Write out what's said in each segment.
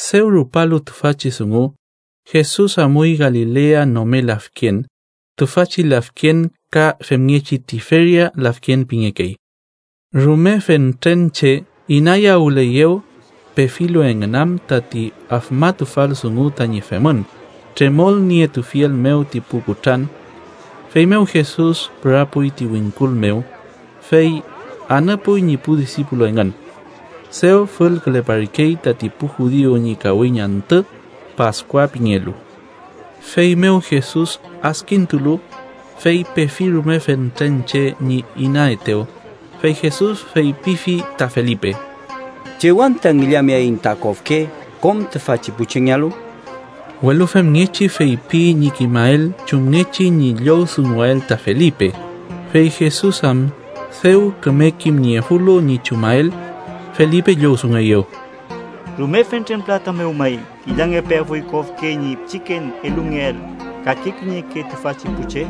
Dew rupalu tüfachi dungu, Jesus amuy Galilea nome lafken (tüfachi lafken ka femngechi Tiferia lafken pingekey). Rume fentren che inayawüleyew, pefilu engün am tati afmatufal dungu tañi femün, tremolnietufiel mew ti pu kutran. Feymew Jesus pürapuy ti wingkul mew, fey anüpuy ñi pu disipulu engün. Dew fülküleparkey tati pu judiu ñi kawiñ antü, Paskua pingelu. Feymew Jesus adkintulu, fey pefi rume fentren che ñi inaetew, fey Jesus feypifi ta Felipe: —¿Chew anta ngillameaiñ ta kofke kom tüfachi pu chengealu? Welu femngechi feypi ñi kimael chumngechi ñi llowdunguael ta Felipe, fey Jesus am dew küme kimniefulu ñi chumael. Felipe llowdungueyew: —Rume fentren pülata mew may ngillangepeafuy kofke ñi pichiken elungeael kake kiñeke tüfachi pu che.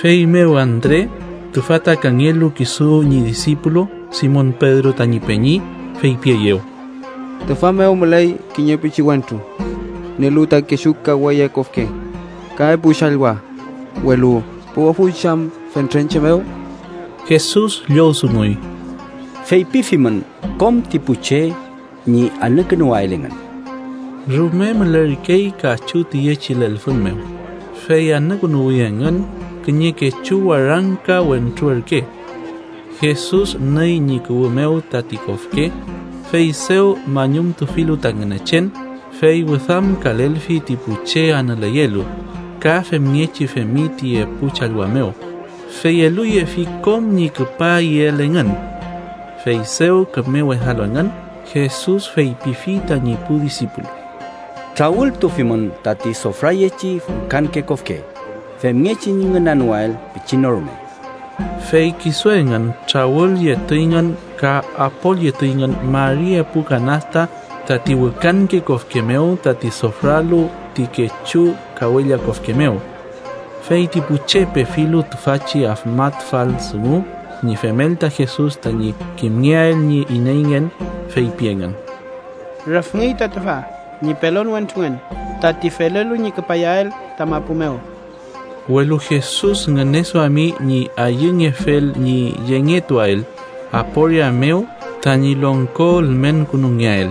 Feymew Andre, tüfa ta kangelu kisu ñi disipulu Simon Pedro tañi peñi, feypieyew: —Tüfa mew müley kiñe pichiwentru nielu ta kechu kawella kofke ka epu challwa, welu ¿puwafuy chey am fentren che mew? Jesus llowdunguy: —Feypifimün kom ti pu che ñi anükünuwael engün. Rume mülerkey kachu tüyechi lelfün mew, fey anükünuwi engün. Kiñe kechu warangka wentru ürke. Jesus nüy ñi kuwü mew tati kofke, fey dew mañumtufilu ta Ngünechen, fey wüdamkalelfi ti pu che anüleyelu, ka femngechi femi ti epu challwa mew, fey eluyefi kom ñi küpa iel engün. Fey dew küme wedalu engün, Jesus feypifi tañi pu disipulu: —Trawültufimün tati sofrayechi wükanke kofke, femngechi ñi ngünanoael pichin no rume. Fey kisu engün trawülyetuyngün ka apolyetuyngün mari epu kanasta tati wükanke kofke mew, tati sofralu ti kechu kawella kofke mew. Fey ti pu che, pefilu tüfachi afmatufal dungu ñi femel ta Jesus tañi kimngeael ñi ineyngen, feypi engün: —Rüfngey ta tüfa ñi pelon wentrungen tati felelu ñi küpayael ta mapu mew. Welu Jesus ngüneduami ñi ayüngefel ñi yengetuael aporia mew tañi longko ülmenkünungeael,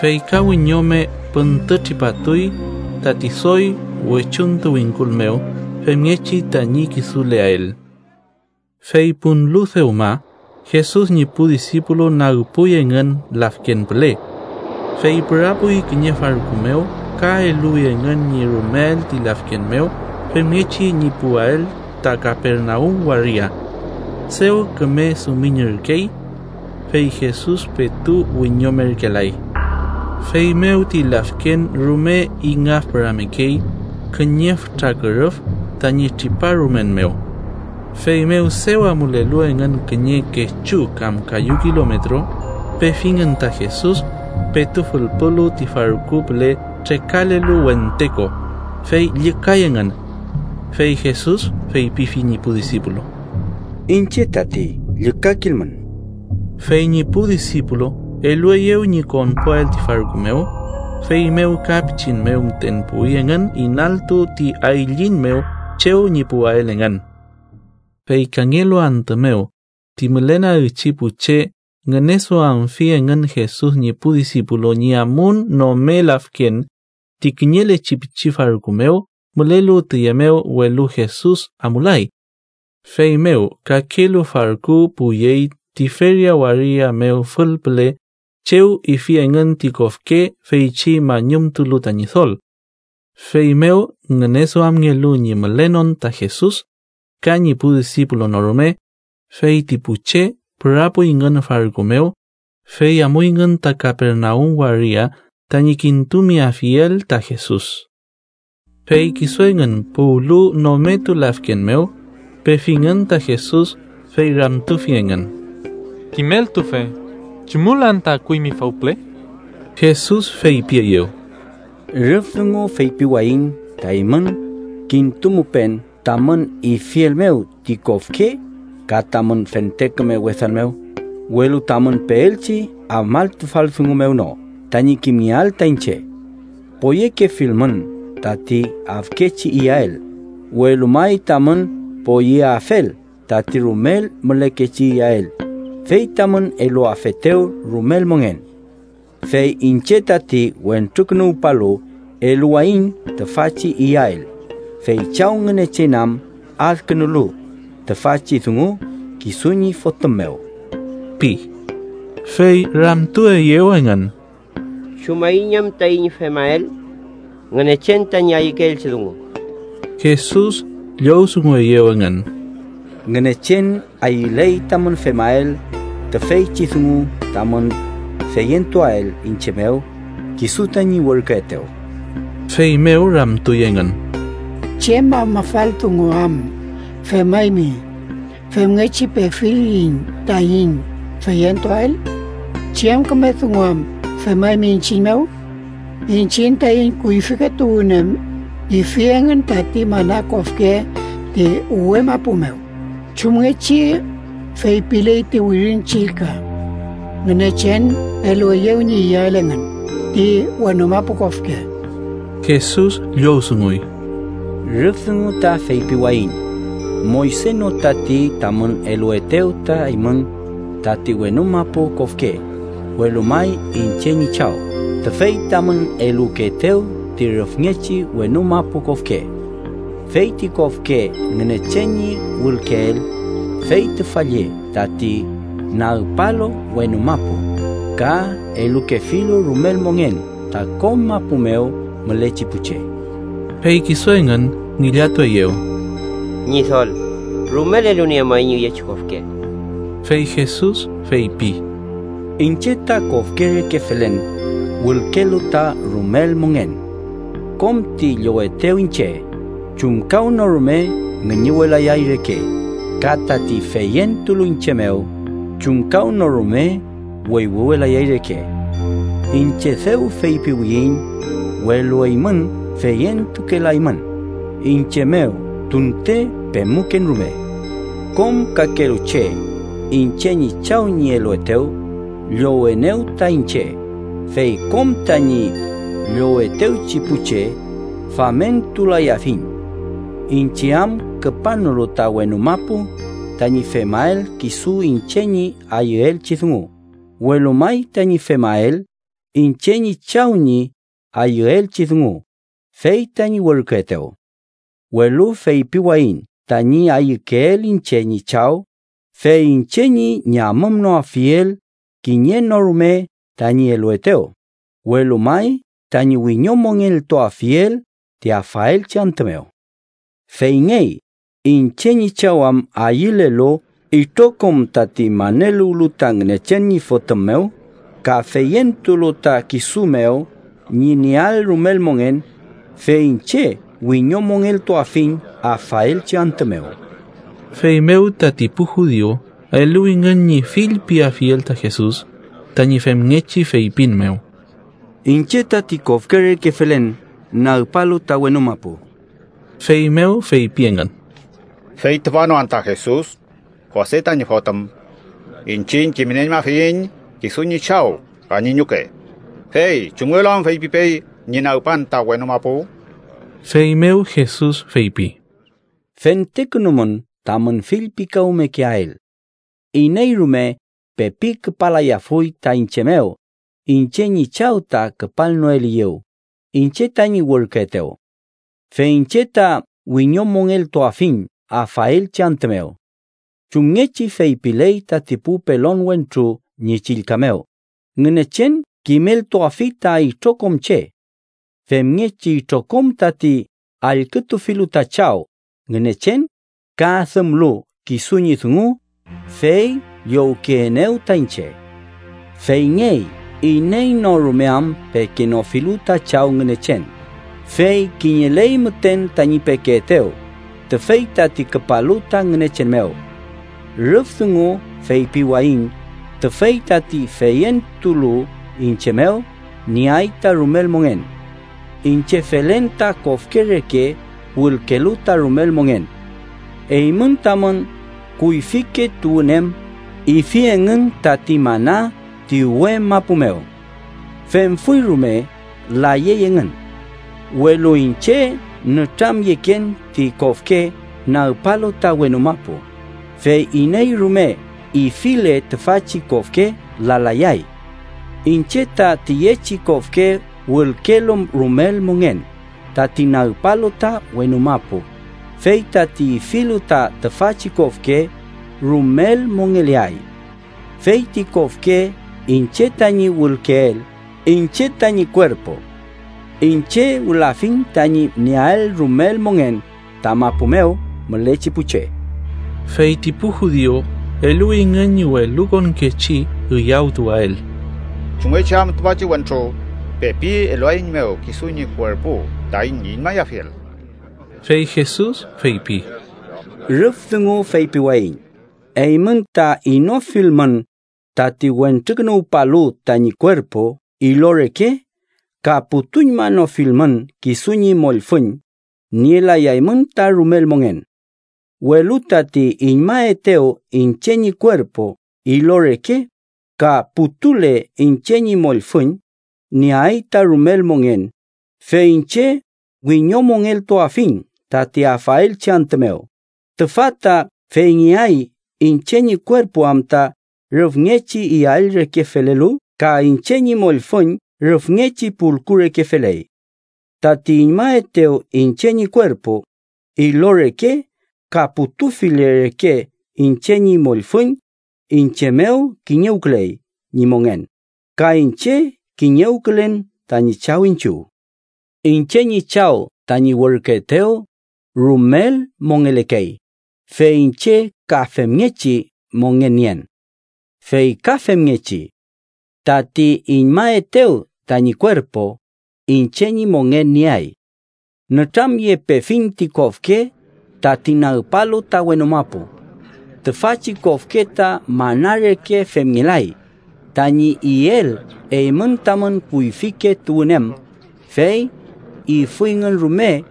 fey ka wiñome püntütripatuy tati doy wechuntu wingkul mew, femngechi tañi kisuleael. Fey punlu dewma, Jesus ñi pu disipulu nagpuy engün lafken püle. Fey pürapuy kiñe farku mew ka eluwi engün ñi rumeael ti lafken mew femngechi ñi puwael ta Kapernaum waria. Dew küme dumiñürkey. Fey Jesus petu wiñomerkelay. Feymew ti lafken rume ingafpüramekey kiñe fütra kürüf tañi triparumen mew. Feymew dew amulelu engün kiñe kechu kam kayu kilometro, pefingün ta Jesus, petu fülpulu ti farku püle trekalelu wente ko, fey llükay engün. Fey Jesus feypifi ñi pu disipulu: —¡Iñche tati! ¡Llükakilmün! Fey ñi pu disipulu elueyew ñi konpuael ti farku mew, feymew ka pichin mew müten puwi engün inaltu ti ayliñ mew chew ñi puwael engün. Fey kangelu antü mew, ti mülenagchi pu che ngüneduamfi engün Jesus ñi pu disipulu ñi amun nome lafken ti kiñelechi pichi farku mew mülelu tüye mew, welu Jesus amulay. Feymew kakelu farku puwyey Tiferia waria mew fülpüle chew ifi engün ti kofke feychi mañumtulu ta Ñidol. Feymew ngüneduamngelu ñi mülenon ta Jesus ka ñi pu disipulu no rume, fey ti pu che pürapuyngün farku mew, fey amuyngün ta Kapernaum waria tañi kintumeafiel ta Jesus. Fey kisu engün puwlu nometu lafken mew, pefingün ta Jesus, fey ramtufi engün: —Kimeltufe, ¿chumül anta akuymi fawpüle? Jesus feypieyew: —Rüf dungu feypiwayiñ ta eymün kintumupen tamün ifiel mew ti kofke ka tamün fente küme wedan mew, welu tamün peelchi afmatufal dungu mew no tañi kimngeael ta iñche. Poyekefilmün tati afkechi iyael, welu may tamün poyeafel tati rumel mülekechi iyael fey tamün eluafetew rumel mongen. Fey iñche tati Wentrukünuwpalu eluwayiñ tüfachi iyael, fey Chaw Ngünechen am adkünulu tüfachi dungu kisu ñi Fotüm mew ―pi. Fey ramtueyew engün: —¿Chumaiñ am taiñ femael Ngünechen tañi ayükeelchi dungu? Jesus llowdungueyew engün: —Ngünechen ayüley tamün femael tüfeychi dungu tamün feyentuael iñche mew kisu tañi werküetew. Feymew ramtuy engün: —¿Chem afmafal dungu am femaymi femngechi pefiliyiñ taiñ feyentuael? ¿Chem küme dungu am femaymi iñchiñ mew? Iñchiñ taiñ kuyfike tuwün em ifi engün tati mana kofke ti uwe mapu mew, chumngechi feypiley ti Wirin Chillka: ‘Ngünechen elueyew ñi iyael engün ti wenu mapu kofke.’ Jesus llowdunguy: —Rüf dungu ta feypiwayiñ Moyse no tati tamün eluetew ta eymün tati wenu mapu kofke, welu may iñche ñi Chaw tüfey tamün elukeetew ti rüfngechi wenu mapu kofke. Fey ti kofke Ngünechen ñi wülkeel fey tüfa lle tati nagpalu wenu mapu, ka elukefilu rumel mongen ta kom mapu mew mülechi pu che. Fey kisu engün ngillatueyew: —Ñidol, rumel eluniemuaiñ üyechi kofke. Fey Jesus feypi: —Iñche ta kofke reke felen wülkelu ta rumel mongen. Kom ti llowetew iñche, chumkawnorume ngüñüwelayay reke, ka tati feyentulu iñche mew chumkawnorume wüywüwelayay reke. Iñche dew feypiwiyiñ, welu eymün feyentukelaymün iñche mew tunte pemuken rume. Kom kakelu che iñche ñi Chaw ñi eluetew, llowenew ta iñche, fey kom tañi llowetewchi pu che, famentulayafiñ. Iñche am küpanolu ta wenu mapu tañi femael kisu iñche ñi ayüelchi dungu, welu may tañi femael iñche ñi Chaw ñi ayüelchi dungu, fey tañi werküetew. Welu feypiwayiñ tañi ayükeel iñche ñi Chaw, fey iñche ñi ñamümnoafiel kiñe no rume tañi eluetew, welu may tañi wiñomongeltuafiel ti afaelchi antü mew. Feyngey iñche ñi Chaw am ayülelu itrokom tati maneluwlu ta Ngünechen ñi Fotüm mew ka feyentulu ta kisu mew ñi nieael rumel mongen, fey iñche wiñomongeltuafiñ afaelchi antü mew. Feymew tati pu judiu eluwingün ñi fillpiafiel ta Jesus, tañi femngechi feypin mew: “Iñche tati kofke reke felen nagpalu ta wenu mapu.” Feymew feypi engün: —¿Fey tüfa no anta Jesus, Jose tañi fotüm? Iñchiñ kimnieñmafiyiñ kisu ñi chaw ka ñi ñuke, fey ¿chumngelu am feypipey ñi nagpan ta wenu mapu? Feymew Jesus feypi: —Fentekünumün tamün fillpikawmekeael. Iney rume pepi küpalayafuy ta iñche mew, iñche ñi Chaw ta küpalnoeliyew, iñche tañi werküetew. Fey iñche ta wiñomongeltuafiñ afaelchi antü mew. Chumngechi feypiley tati pu pelon wentru ñi chillka mew: ‘Ngünechen kimeltuafi ta itrokom che’. Femngechi itrokom tati allkütufilu ta Chaw Ngünechen, ka adümlu kisu ñi dungu, fey llowkeenew ta iñche. “Feyngey iney no rume am pekenofilu ta Chaw Ngünechen, fey kiñeley müten tañi pekeetew, tüfey tati küpalu ta Ngünechen mew. Rüf dungu feypiwayiñ tüfey tati feyentulu iñche mew, nieay ta rumel mongen. Iñche felen ta kofke reke wülkelu ta rumel mongen. Eymün tamün kuyfike tuwün em ifi engün tati mana ti uwe mapu mew. Femfuy rume, layey engün. Welu iñche nütramyeken ti kofke nagpalu ta wenu mapu, fey iney rume ifile tüfachi kofke, lalayay. Iñche ta tüyechi kofke wülkelu rumel mongen tati nagpalu ta wenu mapu, fey tati ifilu ta tüfachi kofke, rumel mongeleay. Feyti kofke iñche tañi wülkeel iñche tañi kuerpu. Iñche wülafiñ tañi nieael rumel mongen ta mapu mew mülechi pu che.” Fey ti pu judiu eluwingün ñi welukonkechi üyawtuwael: —¿Chumngechi am tüfachi wentru pepi eluaeiñmew kisu ñi kuerpu taiñ iñmayafiel? Fey Jesus feypi: —Rüf dungu feypiwayiñ eymün ta inofilmün tati Wentrukünuwpalu tañi kuerpu ilo reke ka putuñmanofilmün kisu ñi mollfüñ, nielayaymün ta rumel mongen. Welu tati iñmaetew iñche ñi kuerpu ilo reke ka putule iñche ñi mollfüñ, nieay ta rumel mongen, fey iñche wiñomongeltuafiñ tati afaelchi antü mew. Tüfa ta feyngeay iñche ñi kuerpu am ta rüfngechi iyael reke felelu ka iñche ñi mollfüñ rüfngechi pulku reke feley. Tati iñmaetew iñche ñi kuerpu ilo reke ka putufile reke iñche ñi mollfüñ, iñche mew kiñewküley ñi mongen, ka iñche kiñewkülen tañi Chaw iñchiw. Iñche ñi Chaw, tañi werküetew, rumel mongelekey, fey iñche ka femngechi mongen nien. Fey ka femngechi: tati iñmaetew tañi kuerpu, iñche ñi mongen nieay. Nütramyepefiñ ti kofke tati nagpalu ta wenu mapu. Tüfachi kofke ta mana reke femngelay tañi iel eymün tamün kuyfike tuwün em, fey ifuyngün rume,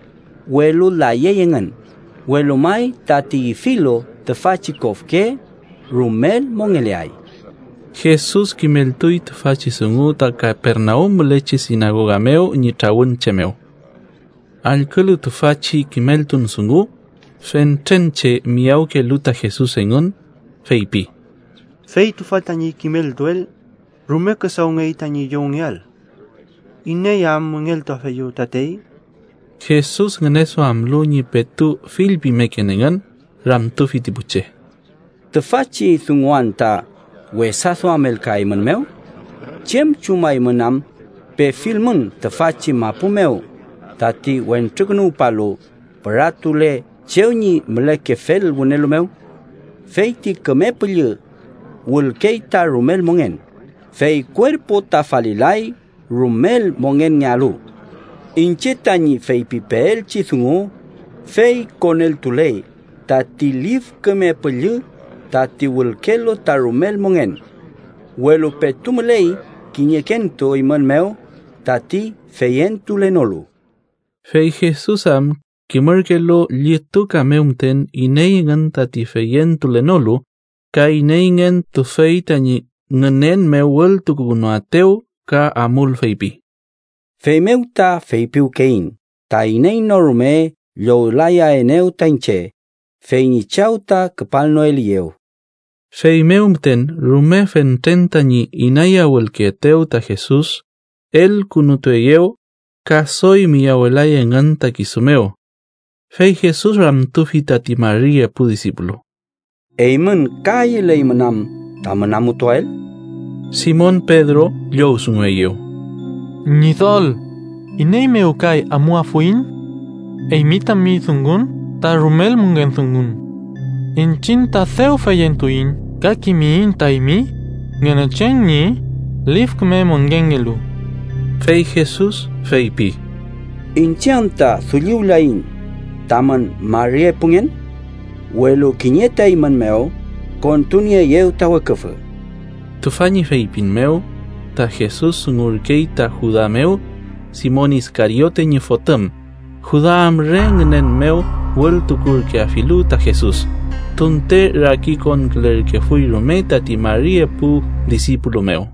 welu layey engün, welu may tati ifilu tüfachi kofke rumel mongeleay. Jesus kimeltuy tüfachi dungu ta Kapernaum mülechi sinagoga mew ñi trawün che mew. Allkülu tüfachi kimeltun dungu, fentren che miyawkelu ta Jesus engün, feypi: —Fey tüfa tañi kimeltuel rume küdawngey tañi llowngeael. ¿Iney am müngeltuafeyew tatey? Jesus ngüneduamlu ñi petu fillpimeken engün, ramtufi ti pu che: —¿Tüfachi dungu anta wesaduamelkaeymünmew? ¿Chem chumaymün am, pefilmün tüfachi mapu mew tati Wentrukünuwpalu püratule chew ñi mülekefel wünelu mew? Feyti Küme Püllü wülkey ta rumel mongen; fey kuerpu ta falilay rumel mongenngealu. Iñche tañi feypipeelchi dungu, fey koneltuley tati Lif Küme Püllü tati wülkelu ta rumel mongen. Welu petu müley kiñekentu eymün mew tati feyentulenolu. Fey Jesus am kimürkelu llituka mew müten iney engün tati feyentulenolu ka ineyngen tüfey tañi ngünen mew wültukukünuaetew. Ka amul feypi: —Feymew ta feypiwkeyiñ ta iney no rume llowlayaenew ta iñche, fey ñi Chaw ta küpalnoeliyew. Feymew müten, rume fentren tañi inayawülkeetew ta Jesus, elkünutueyew, ka doy miyawelay engün ta kisu mew. Fey Jesus ramtufi tati mari epu disipulu: —¿Eymün ka ayüleymün am tamün amutuael? Simon Pedro llowdungueyew: —Ñidol, ¿iney mew kay amuafuiñ? Eymi tami dungun ta rumel mongen dungun. Iñchiñ ta dew feyentuiñ ka kimiyiñ ta eymi Ngünechen ñi Lif Küme Mongenngelu. Fey Jesus feypi: —¿Iñche anta dulliwlayiñ tamün mari epungen? Welu kiñe ta eymün mew kontunieeyew ta weküfü. Tüfa ñi feypin mew, ta Jesus dungurkey ta Juda mew, Simon Iskariote ñi fotüm, Juda am re ngünen mew wültukurkeafilu ta Jesus, tunte rakikonkülerkefuy rume tati mari epu disipulu mew.